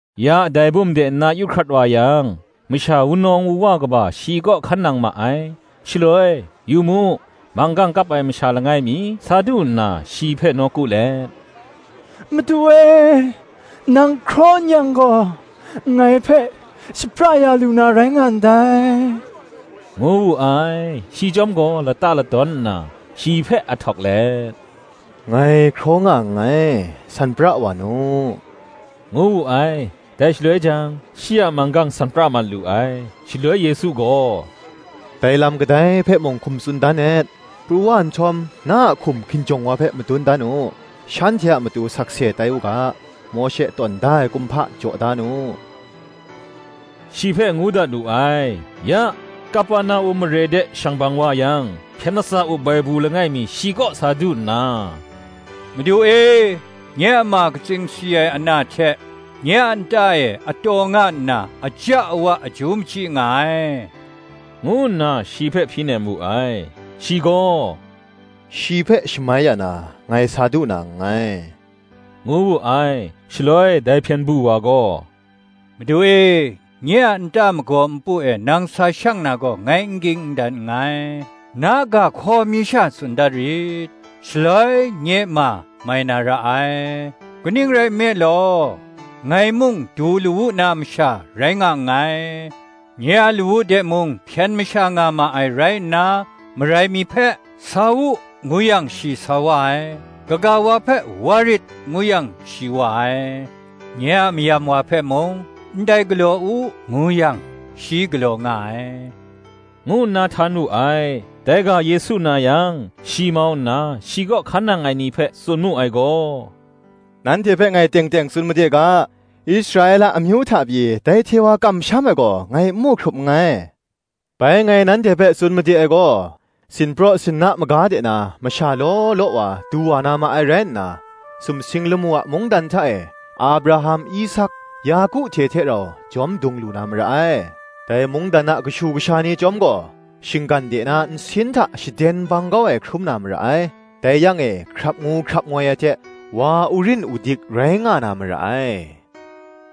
Ya, dai bum de nna yu hkrat wa yang, masha wunawng wuwa kaba shi kaw hkan nang ma ai. Shaloi, yu mu, manggang kap ai masha langai mi sa du nna shi hpe nawku let, “Madu e, nang hkraw n yang gaw, ngai hpe shapra ya lu na rai nga ndai,” ngu wu ai. Shi chyawm gaw lata ladawn nna, shi hpe ahtawk let, “Ngai hkraw nga nngai, san pra wa nu,” ngu wu ai: dai shaloi jang, shi a manggang san pra mat lu ai. Shaloi Yesu gaw, “Dai lam kadai hpe mung hkum tsun dan et; pru wa nhtawm na hkum hkinjawng wa hpe madun dan u; shanhte a matu sakse tai u ga, Mawshe tawn da ai kumhpa jaw da nu,” shi hpe ngu dat wu ai. Ya, Kaperna-um mare de shang bang wa yang hpyen latsa up ai bu langai mi shi kaw sa du nna, “Madu e, nye a ma katsing si ai ana hte nye a nta e a taw nga nna, aja awa aju machyi nga ai,” ngu nna shi hpe hpyi nem wu ai. Shi gaw, “Shi hpe shamai ya na, ngai sa du na nngai,” ngu wu ai. Shaloi dai hpyen du wa gaw, “Madu e, nye a nta magaw npu e nang sa shang na gaw, ngai n ging n dan nngai: na ga hkaw mi sha tsun dat rit, shaloi nye ma mai na ra ai. Kaning rai nme law, ngai mung du lawu na masha rai nga nngai, nye a lawu de mung hpyen masha nga ma ai rai nna, marai mi hpe, ‘Sa u,’ ngu yang, shi sa wa ai; kaga wa hpe, ‘wa rit’ ngu yang, shi wa ai; nye a mayam wa hpe mung, ‘Ndai galaw u,’ ngu yang, shi galaw nga ai,” ngu nna htan wu ai. Dai ga Yesu na yang shi mau nna shi kaw hkan nang ai ni hpe tsun mu ai gaw, “Nanhte hpe ngai teng teng tsun made ga, Israela amyu hta pyi, dai hte wa kamsham ai gaw ngai n mu hkrup nngai; Bai ngai nanhte hpe tsun made ai gaw, sinpraw sinna maga de na, masha law law wa du wa na ma ai rai nna, sumsing lamu a mungdan hta e, Abraham, Isak, Yaku hte hte rau jawm dung lu na mara ai. Dai mungdan a kashu kasha ni chyawm gaw, shinggan de na nsin hta shaden bang kau ai hkrum na mara ai: dai yang e, hkrap ngu hkrap ngoi ai hte wa urin udik rai nga na mara ai,”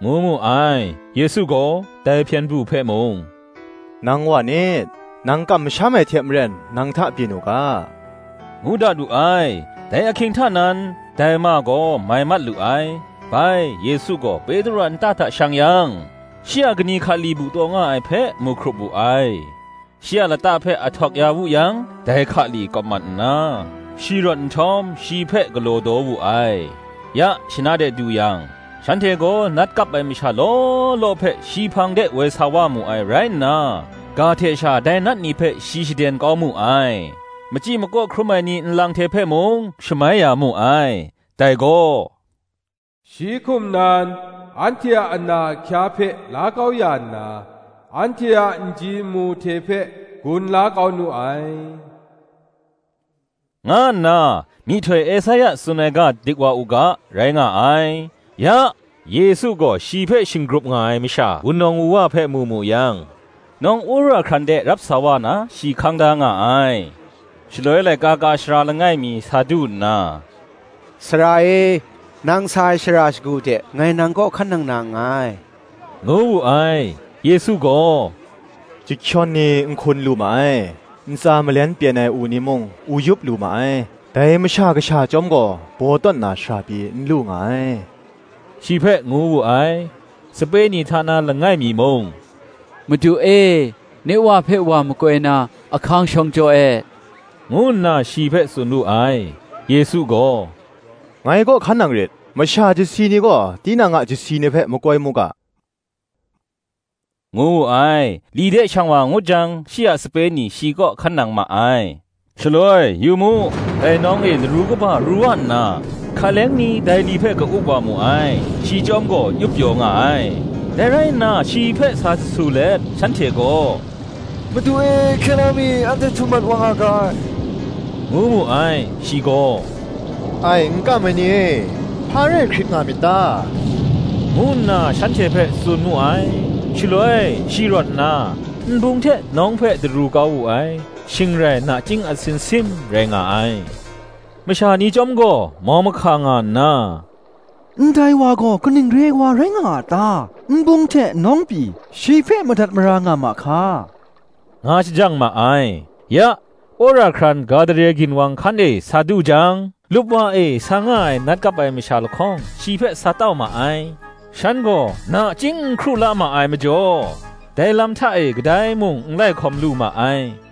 ngu mu ai. Yesu gaw, dai hpyen du hpe mung, “Nang wa nit: Nang kamsham ai hte maren nang hta byin u ga,” ngu dat wu ai. Dai ahkying hta nan, dai ma gaw mai mat lu ai. Bai, Yesu gaw Petru a nta hta shang yang, shi a kani hkali bu taw nga ai hpe mu hkrup wu ai. Shi a lata hpe ahtawk ya wu yang, dai hkali kawp mat nna, shi rawt nhtawm, shi hpe galaw daw wu ai. Ya, shana de du yang, shanhte gaw nat kap ai masha law law hpe shi hpang de woi sa wa mu ai rai nna, ga hte sha dai nat ni hpe shi shaden kau mu ai; machyi makaw hkrum ai ni nlang hte hpe mung, shamai ya mu ai. Dai gaw, Shi hkum nan, “anhte a ana ahkya hpe la kau ya nna, anhte a nji nmu hte hpe gun la kau nu ai,” nga nna, myihtoi Esaia tsun ai ga dik wa u ga, rai nga ai. Ya, Yesu gaw shi hpe shinggrup nga ai masha wunawng wuwa hpe mu mu yang, nawng wora hkran de rap sa wa na shi hkang da nga ai. Shaloi laika ka ai sara langai mi sa du nna, “Sara e, nang sa ai shara shagu de, ngai nang kaw hkan nang na nngai,” ngu wu ai. Yesu gaw, “Chyahkyawn ni nhkun lu ma ai, ntsa malen pyen ai u ni mung u yup lu ma ai; dai Masha Kasha chyawm gaw baw tawn na shara pyi n lu nga ai,” shi hpe ngu wu ai. Sape ni hta na langai mi mung, “Madu e, nye wa hpe wa makoi na ahkang shawng jaw e,” ngu nna shi hpe tsun wu ai. Yesu gaw, “Ngai kaw hkan nang rit; masha chyasi ni gaw, tinang a chyasi ni hpe makoi mu ga,” ngu wu ai. Li de shang wa ngut jang shi a sape ni shi kaw hkan nang ma ai. Shaloi, yu mu, dai nawng e laru kaba ru wa nna, hka leng ni dai li hpe ka-up wa mu ai; shi chyawm gaw yup pyaw nga ai. Dai rai nna shi hpe sa jasu let shanhte gaw, “Madu e, hkye la mi, anhte htum mat wa nga ga ai,” ngu mu ai. Shi gaw, “Ai n kam ai ni e, hpa rai hkrit nga myit ta?” ngu nna shanhte hpe tsun mu ai. Shaloi shi rawt nna, nbung hte nawng hpe daru kau wu ai: shing rai nachying atsin sim rai nga ai. Masha ni chyawm gaw, mau mahka nga nna, “Ndai wa gaw kaning re ai wa rai nga a ta? nbung hte nawng pyi, shi hpe madat mara nga ma hka?” nga shajang ma ai. Ya, wora hkran Gadare ginwang hkan e sa du jang, lupwa e sa nga ai nat kap ai masha lahkawng, shi hpe sa tau ma ai: shan gaw nachying n hkru la nga ma ai majaw, dai lam hta e kadai mung n lai hkawm lu ma ai.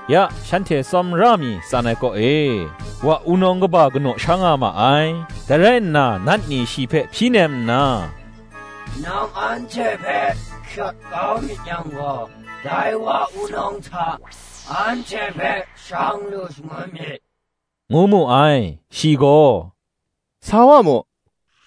Ya shanhte hte tsawmra mi tsan kaw e, wa wunawng kaba kanaw sha nga ma ai. Dai rai nna, nat ni shi hpe hpyi nem nna, “Nang anhte hpe hkyawt kau mi yang gaw, dai wa wunawng hta anhte hpe shang lu shangun mi,” ngu mu ai. Shi gaw, “Sa wa mu,”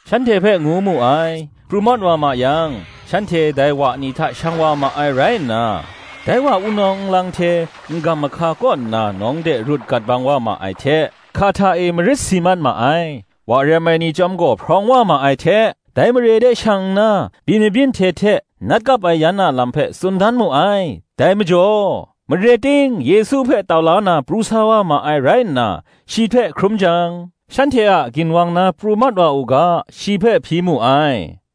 shanhte hpe ngu mu ai. Pru mat wa ma yang, shanhte dai wa ni hta shang wa ma ai rai nna, dai wa wunawng nlang hte n-gam mahka kaw nna nawng de rut gat bang wa ai hte, hka hta e marit si mat ma ai. Wa rem ai ni chyawm gaw hprawng wa ma ai hte, dai mare de shang nna, byin mabyin hte hte, nat kap ai yan a lam hpe tsun dan mu ai. Dai majaw, mare ting Yesu hpe tau la na pru sa wa ma ai rai nna, shi hte hkrum jang, shanhte a ginwang na pru mat wa u ga, shi hpe hpyi mu ai.